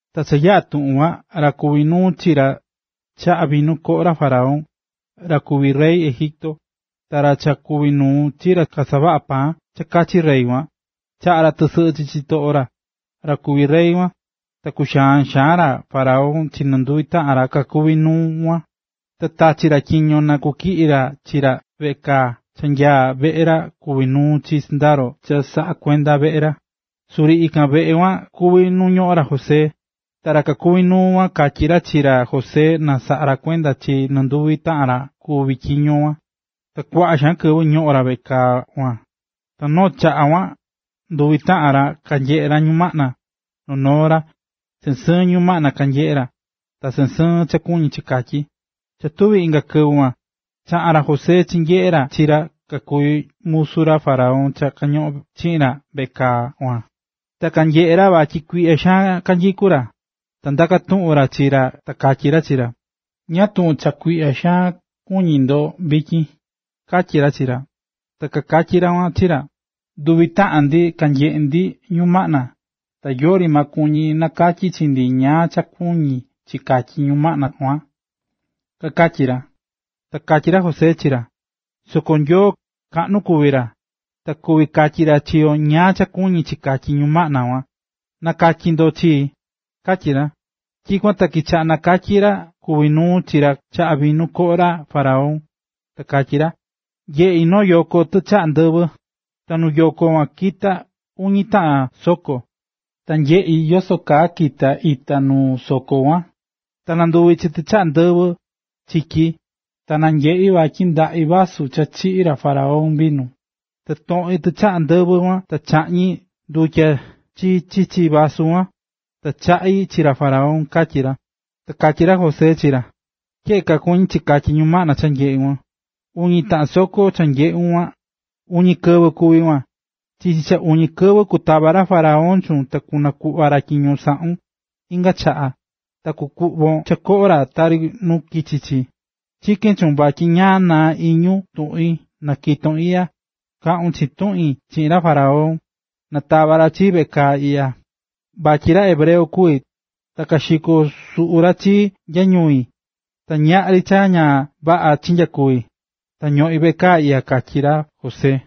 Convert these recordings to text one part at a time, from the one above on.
Cha yaꞌa̱ tuꞌun kuan, ra kuví nuu chi ra kachaꞌá vinu koꞌo ra faraón, ra kuví rey Egipto, ta ra cha kuví nuu chi ra kasavaꞌá paan cha kachi rey kuan, kachaꞌa̱ ra tɨsɨꞌɨ chi chitoꞌo ra, ra kuví rey kuan. Ta kuxaa̱n xaan ra faraón chi nduvi taꞌan ra kakuví nuu kuan. Ta tachi̱ ra tyiño na kutyiꞌi ra chi ra veꞌe kaa cha nyaá veꞌe ra kuví nuu chi sɨndaro cha kasaꞌá kuenda veꞌe ra, suri ikan veꞌe kaa kuan kuví nu ñoꞌón ra José. Ta ra kuví nuu kuan katyí ra chi ra José na saꞌa kuenda ra chi nɨnduvi taꞌan ra kuvi̱ tyiño kuan, ta kuaꞌa xaan kɨvɨ kañoꞌón ra veꞌe kaa kuan. Noo chakuaa kuan, nɨnduvi taꞌan ra, kanyeꞌe̱ ra ñumaꞌna, noo noo ra, sɨɨn sɨɨn ñumaꞌna kanyeꞌe̱ ra, ta sɨɨn sɨɨn cha kuñí chi katyí. Cha tuví inga kɨvɨ kuan, chaꞌa̱n ra José chinyeꞌe̱ ra chi ra kakuví musu ra faraón cha kañoꞌón chiꞌin ra veꞌe kaa kuan, ta nanyeꞌe̱ ra vatyi kuiꞌya xaan kanyikú ra. Ta ndaka̱ tuꞌun ra chi ra ta katyí ra chi ra: ―¿Ñáá tuꞌun cha kuiꞌya xaan kuñí ndo vityin? ―katyí ra chi ra. Ta kakatyí ra kuan chi ra: ―Nduvi taꞌan ndi kanyeꞌe̱ ndi numaꞌna, ta yori maa kuví nakatyi chi ndi ñáá cha kuñí chi katyi ñumaꞌna kuan ―kakatyi ra. Ta katyi ra José chi ra: ―Soko Nyoo, kaꞌnu kuvi ra, ta kuvi katyi ra chi yo ñáá cha kuñí chi katyí ñumaꞌna kuan. Na̱katyi ndo chii ―katyí ra. Tyikuan ta kichaꞌa̱ nakatyí ra kuvi̱ nuu chi ra kachaꞌá vinu koꞌo ra faraón, ta katyí ra: ―Nyeꞌí noo yoꞌo tichaꞌa ndɨvɨ.a Ta nuu yoꞌo kuan kita̱ uñi taꞌan soko, ta nyeꞌi̱ yoso kaa kita̱ ita nuu soko kuan, ta nanduvi̱ chi tichaꞌa ndɨvɨ chityí. Ta nanyeꞌi̱ vatyi ndaꞌí vasu cha chiꞌí ra faraón vinu, ta toꞌi̱n tichaꞌa ndɨvɨ kuan ta chaꞌñi̱ ndutya chi chichi vasu kuan, ta chaꞌi̱ chi ra faraón ―katyí ra. Ta katyí ra José chi ra: ―Tyeꞌe kaa kuñí chi katyí ñumaꞌna cha nyeꞌu̱n. Uñi taꞌan soko cha nyeꞌu̱n kuan, uñi kɨvɨ kuví kuan. Chichi cha uñi kɨvɨ kutava ra faraón chuun ta kunakuꞌva ra tyiño saꞌu̱n inga chaꞌa, ta kukuꞌvon cha koꞌo ra tari nu kichi̱ chi. Chikén chuun vatyi ñaꞌan naa iñun tuꞌin na kiton iꞌya, kaꞌun chiin tuꞌin chiꞌin ra faraón, na tava ra chii veꞌe kaa iꞌya. Vatyi ra hebreo kuví, ta kaxiko̱ suꞌu ra chii nya ñui, ta ñaꞌri cha ña vaꞌa chinyakuvi̱, ta ñoꞌín veꞌe kaa iꞌya ―katyi ra José.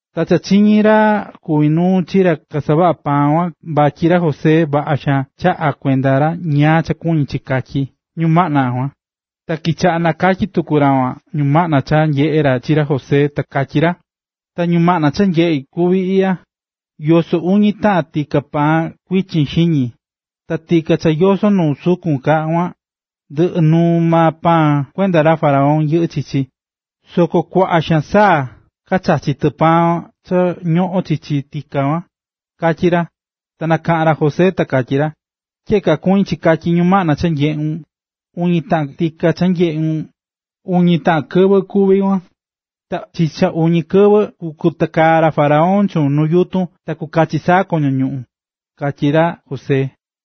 Ta cha chiñi̱ ra kuvi̱ nuu chi ra kasavaꞌá paan kuan vatyi ra José vaꞌa xaan chaꞌa̱ kuenda ra ñáá cha kuñí chi katyí ñumaꞌna kuan, ta kichaꞌa̱ nakatyí tuku ra kuan ñumaꞌna cha nyeꞌe̱ ra chi ra José, ta katyí ra: ―Ta ñumaꞌna cha nyeꞌi̱ kuví iꞌya: yosó uñi taꞌan tika paan kuichin xiñi. Ta tika cha yosó nu sukun ka kuan, ndɨꞌɨ nuu maa paan kuenda ra faraón yɨꞌɨ́ chichi, soko kuaꞌa xaan saa kachachí tɨ paan cha ñoꞌón chichi tika kuan ―katyi ra. Ta nakaꞌa̱n ra José ta katyí ra: ―Tyeꞌe kaa kuñí chi katyi ñumaꞌna cha nyeꞌu̱n, uñi taꞌan tika cha nyeꞌu̱n, uñi taꞌan kɨvɨ kuví kuan. Ta chichi cha uñi kɨvɨ kukatakaa ra faraón chuun nu yutun ta kukachi saa koño ñuꞌún ―katyí ra José.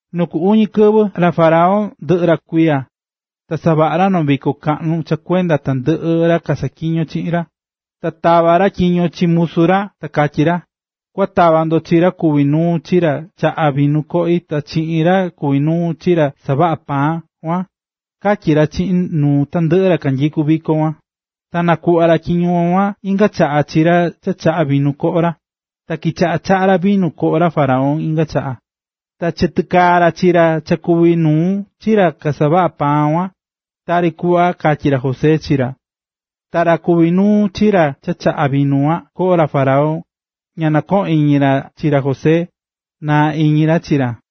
Nu ku uñi kɨvɨ, ra faraón ndɨꞌɨ̱ ra kuiya, ta savaꞌa̱ ra noo viko kaꞌnu cha kuenda tandɨꞌɨ ra kasaꞌatyiñó chiꞌin ra. Ta tava̱ ra tyiño chi musu ra ta katyí ra: ―Kua tava ndo chi ra kuvi̱ nuu chi ra kachaꞌá vinu koꞌi ta chiꞌin ra kuvi̱ nuu chi ra kasavaꞌa̱ paan kuan ―katyí ra chiꞌin nuu tandɨꞌɨ ra kanyikú viko kuan. Ta nakuꞌva̱ ra tyiño kuan inga chaꞌa chi ra cha chaꞌa̱ vinu koꞌo ra. Ta kichaꞌa̱ chaꞌá ra vinu koꞌo ra faraón inga chaꞌa. Ta chitakaa̱ ra chi ra cha kuvi̱ nuu chi ra kasavaꞌá paan kuan, tari kuꞌva katyí ra José chi ra. Ta ra kuví nuu chi ra cha kachaꞌá vinu koꞌo ra faraón, ña nɨkoꞌo̱n iñi ra chi ra José, naá iñi ra chi ra.